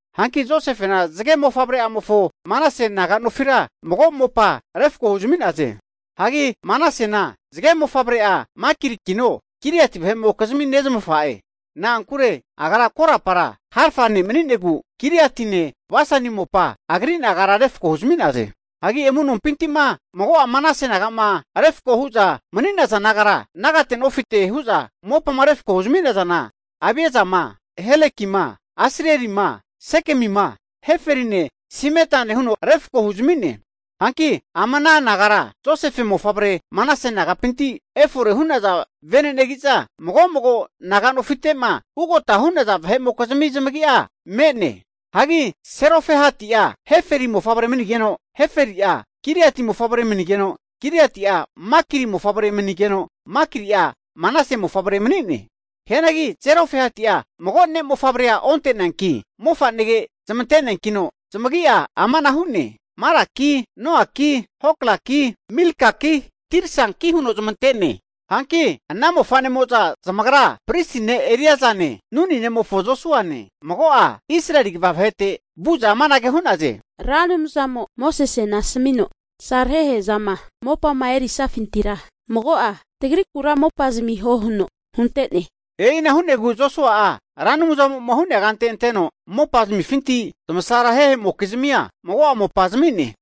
Hanki Josefena zage mofavre'amofo Manase naga nofira mago mopa refko huzami'naze. Hagi Manasena zage mofavre'a Makirikino Gileati vahe'mokizmi nezmafa'e. Na'ankure agra korapara harfa ne' mani'negu Giliatine Basani mopa agri nagara refko huzami'naze. Hagi amu'nompinti'ma mago'a Manase naga'ma refkoma hu'za mani'naza nagara, nagate nofite hu'za mopama refko huzami'nazana, Abiesama, Helekima, Asrielima, Sekemima, Heferine Semitane huno refko huzami'naze. Hanki ama ana nagara Josefe mofavre Manase nagapinti efora hu'naza vene'negi'za, mago mago naga'nofite'ma ugota hu'naza vahe'mokizmi zamagi'a me'ne. Hagi Serofehati'a Heferi mofavre manigeno, Heferi'a Gileati mofavre manigeno, Gileati'a Makiri mofavre manigeno, Makiri'a Manase mofavre mani'ne. Hianagi Zelofehati'a mago ne' mofavrea onte'neanki, mofanege zmante'neankino zamagi'a amanahu hu'ne, Malaki, Noaki, Hoklaki, Milkaki Tirsaki huno zamante'ne. Hanki ana mofa'nemo'za zamagra pristi ne' Eliesane, Nuni nemofo Josuane, mago'a Israeli kva vahete vu'za amanage hu'naze, Ra Anumzamo Mosesena asamino, tasarehe'zama mopama erisafintira mago'a tagrikura mopa zamiho huno hunte'ne. E'ina hu'negu Josua'a Ra Anumzamo'ma hu'nea kante anteno mopazamifinti zamasarerehe'mokizmia mago'a mopa zami'ne.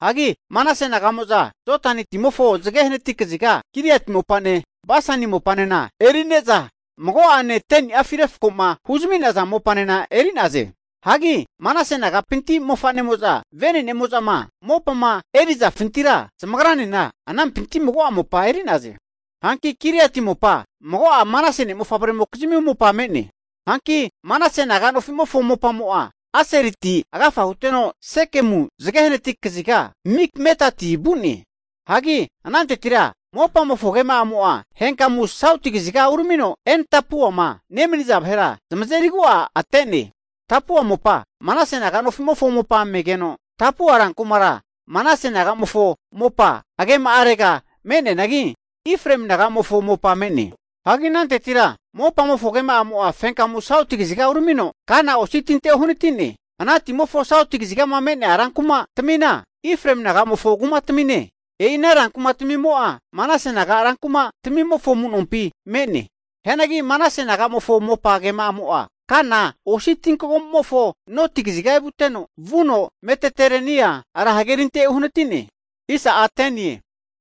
Hagi Manase naga'mo'za Jodani timofo zage hanati kaziga Gileati mopane Bashani mopanena eri'ne'za, mago'ane 10niafi refkoma huzami'naza mopanena eri'naze. Hagi Manase nagapinti mofa'nemo'za, vene'nemo'zama mopama erizafintira zamagranena anampinti mago'a mopa eri'naze. Hanki Gileati mopa mago'a Manase mofavremokizmi mopa me'ne. Hanki Manase naga nofi'mofo mopamo'a, Aseriti agafa huteno Sekemu zage hanati kaziga Mikmetati vu'ne. Hagi anantetira mopamofo agema'amo'a henkamu sauti kaziga uramino En-Tapuama nemaniza vahera zamazerigu'a ate'ne. Tapua mopa Manase naga nofi'mofo mopa megeno, Tapua rankumara Manase naga'mofo mopa agema'arega me'neanagi, Efraemi naga'mofo mopa me'ne. Hagi anantetira mopamofo agema'amo'a fenkamu sauti kaziga uramino Kana osi tinte uhanati'ne. Ana timofo sauti kazigama me'nea rankuma tamina, Efraemi naga'mofo kumatamine. E'ina rankumatamimo'a Manase naga rankumatamimofo amu'nompi me'ne. Hianagi Manase naga'mofo mopa agema'amo'a Kana osi tinkagomu'mofo noti kaziga evuteno, vuno Mediterenia ra hagerintega uhanati'ne.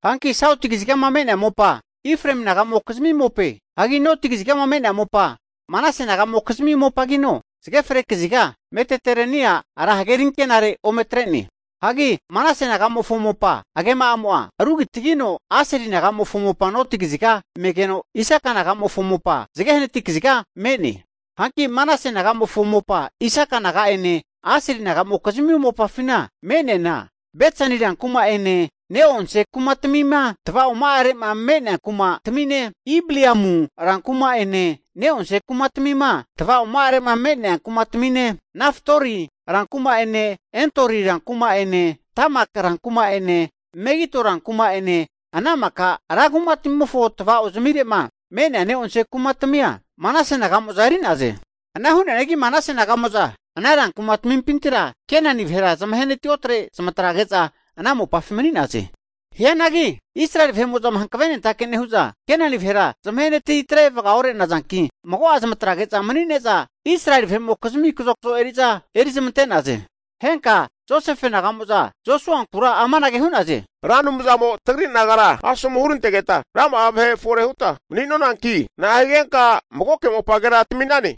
Hanki Sauti kazigama me'nea mopa Efraemi naga'mokizmi mope. Hagi noti kazigama me'nea mopa Manase naga'mokizmi mopagino zage fre kaziga Mediterenia ra hagerikenare ome atre'ne. Hagi Manase naga'mofo mopa agema'amo'a rugitagigeno, Aseli nagamofo mopa noti kaziga megeno, Isakar naga'mofo mopa zage hanati kaziga me'ne. Hanki Manase naga'mofo mopa Isaka naga'ene Aseli naga'mokizmi mopafina me'neana, Betsani rankuma'ene ne'eonse kumatamima tavaoma'are'ma me'nea kumatamine, Ibliamu rankuma'ene, ne'onse kumatamima tava'oma'are'ma me'nea kumatamine, Nafat Dori rankuma'ene, Endori rankuma'ene, Tamak rankuma'ene, Megido rankuma'ene ana maka ra kumatamimofo tavao zamire'ma me'nea neonse kumatamia Manase naga'mo'za eri'naze. Ana hu'neanagi Manase naga'mo'za ana rankumatamimpintira Kenani vahera zamahenati otre zamatrage'za ana mopafi mani'naze. Hianagi Israeli vahe'mo'zama hankave nentake'ma nehu'za, Kenani vahera zamahenatitre vagaore'nazanki, mago'a zamatrage'za manine'za Israeli vahe'mokizmi kazokzo eri'za eri zamante'naze. Henka Josefe naga'mo'za Josuankura amanage hu'naze, Ra Anumzamo tagri nagara asomu hurantegeta rama'a vahe fore huta mani'nonanki, na'a higenka magoke mopagera tami'nane?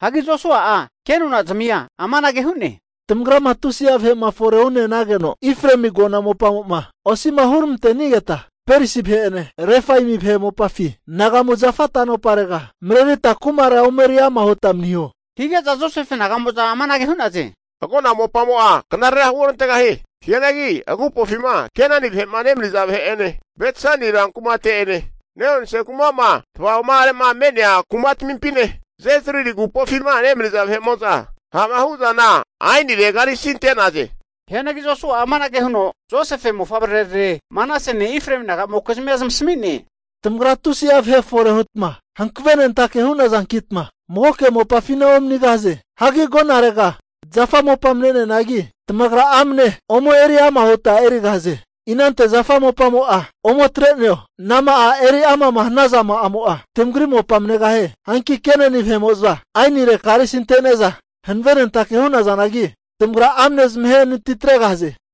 Hagi Josua'a ke nonazmia amanage hu'ne, Tamagrama tusi'a vahe'ma fore hu'ne'nageno Efraemi agona mopamo'ma osi'ma huramante'nigeta, Perisi vahe'ene, Refaimi vahe mopafi anagamu zafa tanoparega marerita kumara ome eriama huta maniho. Hige'za Josefe naga'mo'za amanage hu'naze, agona mopamo'a knarera huorantegahie. Hianagi agupofima Kenani vahe'ma nemaniza vahe'ene, Bet Sani ran kumate'ene, ne'onse kuma'ma tava'oma'are'ma me'nea kumatamimpine, Jezrili agupofima nemaniza ha'ma hu'zana aenire karisi ante'naze. Hianagi Josua'a amanage huno Josefe mofavrerare Manasene, Efraemi naga'mokizmia zamasami'ne, Tamagra tusi'a vahe fore hutma hankavenentake hu'nazankita magoke mopafina omanigahaze. Hagi agonarega zafa mopa me'neanagi, tamagra amane ome eriama huta erigahaze. Inante zafa mopamo'a ome atre'neo, anama'a eriama'ma hanazama'amo'a tamagri mopa manegahie. Hanki Kenani vahe'mo'za aenire karisi ante'ne'za hanvenentake hu'nazanagi, tamagra amne zamahe natitregahaze.